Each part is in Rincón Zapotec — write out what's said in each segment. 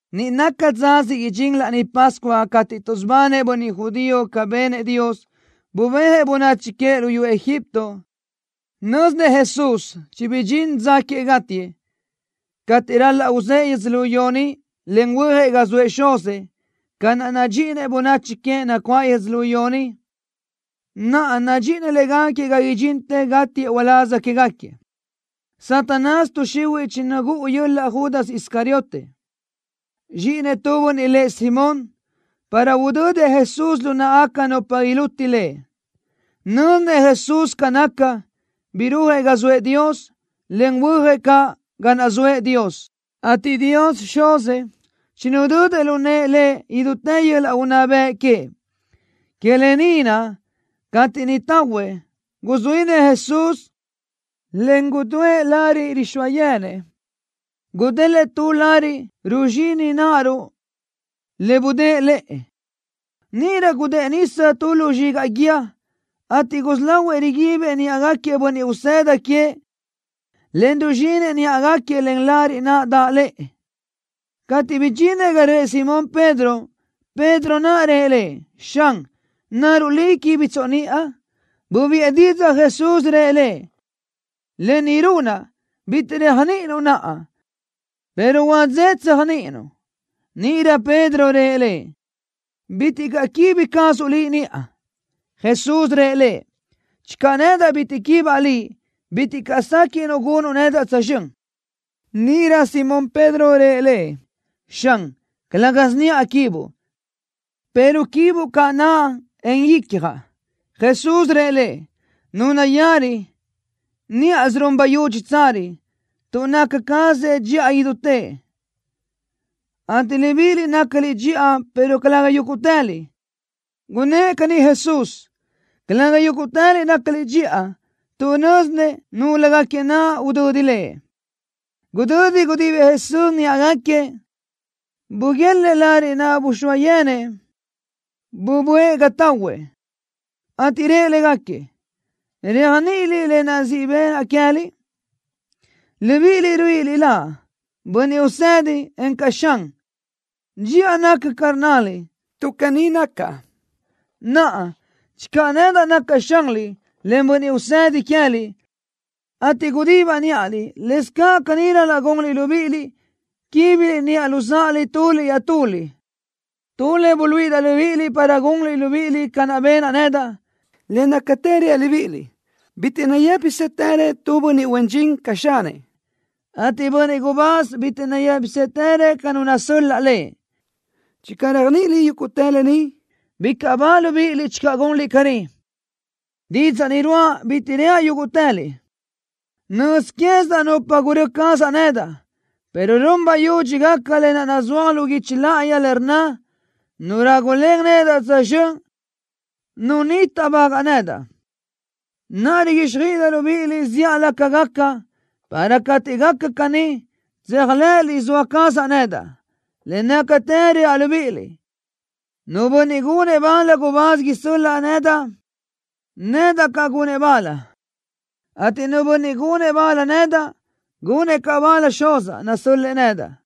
Niʼ naca dza siʼ idxín Laní Pascua cateʼ tuʼsubanëʼ bönniʼ judío ca benëʼ Dios, bubéajëʼ bönachi queëʼ luyú Egipto. Nö́zinëʼ Jesús chibidxín dza queëʼ gátiëʼ, cateʼ ral-laʼ uzë́ʼë yödzölió ni, en huöjëʼ ga zoëʼ Xuzëʼ. Ca naʼ nadxíʼinëʼ bönachi queëʼ nacuáʼ yödzölió ni, naʼa nadxíʼinëʼ légaquiëʼ ga idxintë gátiëʼ uláz quégaquiëʼ. Satanás tuʼ xihuiʼ chinagúʼu yöl-laʼ Judas Iscariote, zxíʼinëʼ tu bönniʼ lëʼ Simón, para udödëʼ Jesús lu náʼagaca nupa iluti Lëʼ. Nö́zinëʼ Jesús ca naca, birúajëʼ ga zoëʼ Dios, en huöjëʼ caʼ ga naʼ zoëʼ Dios, ateʼ Dios Xuzëʼ chinudödëʼ lu nëʼë Lëʼ idútë yöl-laʼ unná bëʼ queëʼ. Que lë ni naʼ, cateʼ niʼ tahuëʼ, guzuínëʼ Jesús, en gudúëʼ lariʼ rixóa yenëʼ. Gudélëʼë tu lariʼ ruzxini náʼaruʼ le budë́ʼë lëʼë. Níʼirö gudë́ʼë nisa tu lu zxigaʼ guíë, ateʼ gusí lahuëʼ riguibëʼ níʼagaquiëʼ bönniʼ usëda queëʼ, en ruzxinëʼ níʼagaquiëʼ len lariʼ naʼ daʼ lëʼë. Cateʼ bidxinëʼ ga röʼë Simón Pedro, Pedro naʼ rëʼ Lëʼ: —Xan, ¿naruʼ Liʼ quíbitsoʼ niʼa? Bubiʼë didzaʼ Jesús, rëʼ lëʼ: —Lë ni runaʼ, bitiʼ réajniʼininuʼ naʼa, pero huadzé tséajniʼinuʼ. Níʼirö Pedro rëʼ Lëʼ: —Bitiʼ caʼ quíbi cazuʼ Liʼ niʼa. Jesús rëʼ lëʼ: —Channö nedaʼ bitiʼ quibaʼ liʼ, bitiʼ caʼ séquiʼnuʼ gunuʼ nedaʼ tsözxö́n. Níʼirö Simón Pedro rëʼ Lëʼ: —Xan, calë́gasö niʼa quibuʼ, pero quibuʼ caʼ naʼa, en icjaʼ. Jesús rëʼ lëʼ: —Nu nayari, níʼasö run bayudxi tsari, tuʼ naca cazëʼ dxiʼa idutëʼ, ateʼ libíʼiliʼ nácaliʼ dxiʼa, pero calëga yúguʼtëliʼ. Gunnë́ʼ caní Jesús: “Calëga yúguʼtëliʼ nácaliʼ dxiʼa”, tuʼ nö́zinëʼ núlögaquiëʼ naʼ udödi Lëʼ. Gudödi gudibëʼ Jesús níʼagaquiëʼ, buguélëʼë lariʼ naʼ buxóa yenëʼ. Buböʼë ga tahuëʼ, ateʼ rëʼ légaquiëʼ: —¿Réajniʼiliʼ lë naʼ siʼ benaʼ queë́liʼ? Libíʼiliʼ ruíʼiliʼ Laʼ: Bönniʼ Usedi encaʼ: Xan. Dxiʼa naca ca rnnaliʼ, tuʼ caní nacaʼ. Naʼa, channö nedaʼ nacaʼ Xanliʼ, en Bönniʼ Usedi queë́liʼ, ateʼ gudibaʼ níʼaliʼ, lëscaʼ caní ral-laʼ gunliʼ libíʼiliʼ, quíbiliʼ niʼa luzáʼaliʼ tuliʼ iaʼtuliʼ. Tu le buluíʼidaʼ libíʼiliʼ para gunliʼ libíʼiliʼ ca naʼ benaʼ nedaʼ. Le nácatë reaʼ libíʼiliʼ: Bitiʼ nayë́pisëtërëʼ tu bönniʼ huen dxin ca xanëʼ, ateʼ bönniʼ gubáz bitiʼ nayë́pisëtërëʼ ca nu nasöl-laʼ lëʼ. Channö réajniʼiliʼ yúguʼtë lë ni, bicaʼ ba libíʼiliʼ channö gunliʼ caní. Didzaʼ ni ruáʼa bitiʼ reaʼ yúguʼtëliʼ. Nöz quézidaʼ nupa gurö́ cazaʼ nedaʼ, pero run bayudxi gaca lë naʼ nazúaj lu guichi láʼayi, le rnna: “Nu rágulen nedaʼ tsözxö́n, nu ni táʼbagaʼ nedaʼ.” Naʼa riguíxjöiʼidaʼ libíʼiliʼ zíʼalö ca gaca, para cateʼ gaca caní, tséajlëʼëliʼ zoa cazaʼ nedaʼ. Le nácatë reaʼ libíʼiliʼ: Nu bönniʼ gunëʼ bal gubáz isö́l-laʼa nedaʼ, nedaʼ caʼ gunëʼ bal, ateʼ nu bönniʼ gunëʼ nedaʼ bal, gunëʼ caʼ bal Xuzaʼ, nasö́l-lëʼë nedaʼ.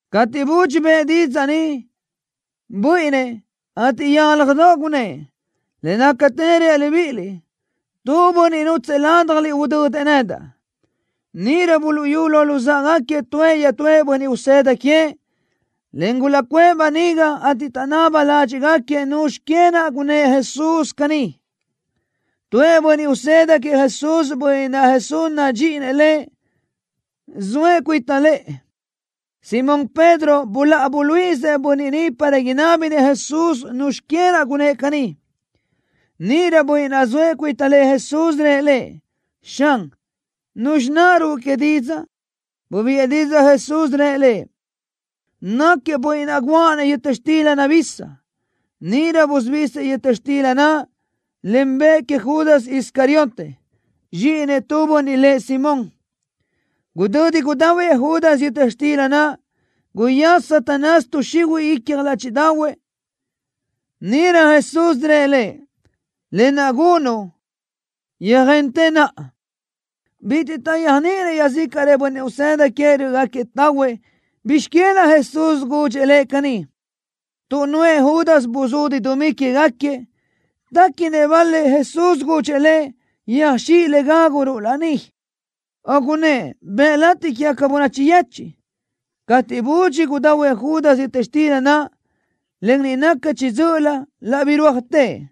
Cateʼ Jesús budxi bëʼë didzaʼ ni, buíʼinnëʼ, ateʼ yálajdoʼ gunnë́ʼ: —Le nácatë reaʼ libíʼiliʼ: Tu bönniʼ nútsëʼë ládjaliʼ udödëʼ nedaʼ. Níʼirö buluʼyú lo luzáʼagaquiëʼ tuëʼ iaʼtúëʼ bönniʼ usëda queëʼ, en gulaʼcuʼë böniga, ateʼ taʼnaba ládxiʼgaquiëʼ nuzxi que naʼ gunnë́ʼ Jesús caní. Tuëʼ bönniʼ usëda queëʼ Jesús, bönniʼ naʼ Jesús nadxíʼinëʼ lëʼ, zoëʼ cuita lëʼë. Simón Pedro buláʼa buluíʼisëʼ bönniʼ ni para inábinëʼ Jesús nuzxi que naʼ gunnë́ʼ caní. Níʼirö bönniʼ naʼ zoëʼ cuita lëʼë Jesús rëʼ Lëʼ: —Xan, ¿nuzxi naʼ ruʼu didzaʼ que? Bubiʼë didzaʼ Jesús, rëʼ lëʼ: —Náquiëʼ bönniʼ naʼ guʼa-nëʼ yöta xtila nabisa. Níʼirö busubísiëʼ yöta xtila naʼ, en bëʼë queëʼ Judas Iscariote, zxíʼinëʼ tu bönniʼ lëʼ Simón. Gudödi gudahuëʼ Judas yöta xtila naʼ, guyaza Satanás tuʼ xihuiʼ icja ládxiʼdaʼahuëʼ. Níʼirö Jesús rëʼ lëʼ: —Lë naʼ gunuʼ, yöjentë naʼa. Bitiʼ taʼyéajniʼinëʼ iaʼzícaʼrëʼ bönniʼ usëda queëʼ rö́ʼögaquiëʼ tahuëʼ bizx que naʼ Jesús gudxëʼ lëʼ caní. Tuʼ nuʼë Judas buzudi dumí quégaquiëʼ, téquinëʼ bal-lëʼ Jesús gudxëʼ lëʼ: Yöxíʼ le gáguruʼ laní, o gunnë́ʼ: Bëʼ latiʼ quégaca bönachi yechiʼ. Cateʼ budxi gudahuëʼ Judas yöta xtila naʼ, en niʼ naca chiʼi dzö́ʼölö, laʼ birúajtëʼ.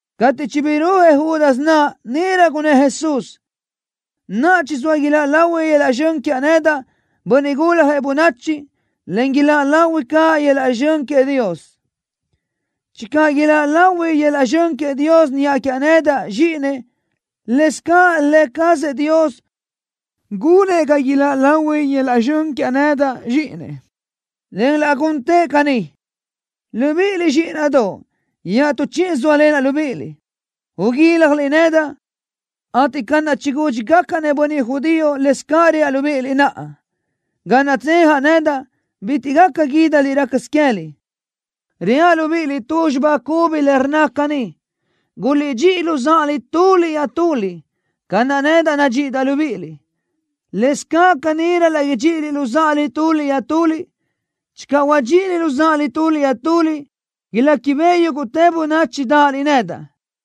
Cateʼ chibirúajëʼ Judas naʼ, níʼirö gunnë́ʼ Jesús: —Naʼa chizóa iláʼ lahui yöl-laʼ zxön quiaʼ nedaʼ, Bönniʼ Guljëʼ Bönachi, en iláʼ lahui caʼ yöl-laʼ zxön queëʼ Dios. Channö iláʼ lahui yöl-laʼ zxön queëʼ Dios niʼa quiaʼ nedaʼ, Zxíʼinëʼ, lëscaʼ Lë cazëʼ Dios gunëʼ ga iláʼ lahui yöl-laʼ zxön quiaʼ nedaʼ, Zxíʼinëʼ, en laʼ guntëʼ caní. Libíʼiliʼ, zxíʼinaʼdoʼ, iaʼtú chíʼisö zóalenaʼ libíʼiliʼ. Uguíljaliʼ nedaʼ, ateʼ ca naʼ chigúdxigacaʼ-nëʼ bönniʼ judío, lëscaʼ reaʼ libíʼiliʼ naʼa: Ga naʼ tsejaʼ nedaʼ, bitiʼ gaca guídaliʼ rácasö queë́liʼ. Reaʼ libíʼiliʼ tu xibá cubi le rnna caní: Guliʼdxíʼi luzáʼaliʼ tuliʼ iaʼtuliʼ. Ca naʼ nedaʼ nadxíʼidaʼ libíʼiliʼ, lëscaʼ caní ral-laʼ idxíʼiliʼ luzáʼaliʼ tuliʼ iaʼtuliʼ. Channö huadxíʼi luzáʼaliʼ tuliʼ iaʼtuliʼ, iléquibeʼe yúguʼtë bönachi dáʼaliʼ nedaʼ.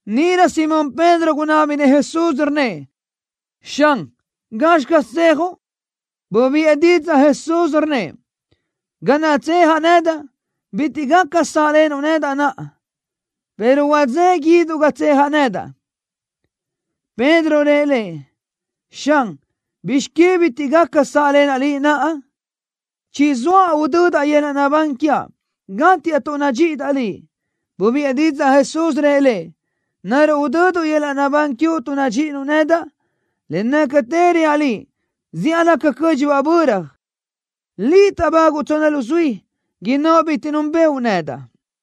Níʼirö Simón Pedro gunábinëʼ Jesús, rnnëʼ: —Xan, ¿gazxi caz tsejuʼ? Bubiʼë didzaʼ Jesús, rnnëʼ: —Ga naʼ tsejaʼ nedaʼ, bitiʼ gaca sáʼlenuʼ nedaʼ naʼa, pero huadzé guíduʼ ga tsejaʼ nedaʼ. Pedro rëʼ Lëʼ: —Xan, ¿bizx que bitiʼ gaca sáʼlenaʼ Liʼ naʼa? Chizóaʼ udödaʼ yöl-laʼ naʼbán quiaʼ, gátiaʼ tuʼ nadxíʼidaʼ Liʼ. Bubiʼë didzaʼ Jesús, rëʼ lëʼ: —¿Naruʼ udöduʼ yöl-laʼ naʼbán quiuʼ tuʼ nadxíʼinuʼ nedaʼ? Le nácatë reaʼ liʼ, zíʼalö ca cö́dxibaʼ böra, liʼ táʼbáguʼu tsonna luzuí, innóʼ bitiʼ núnbëʼu nedaʼ.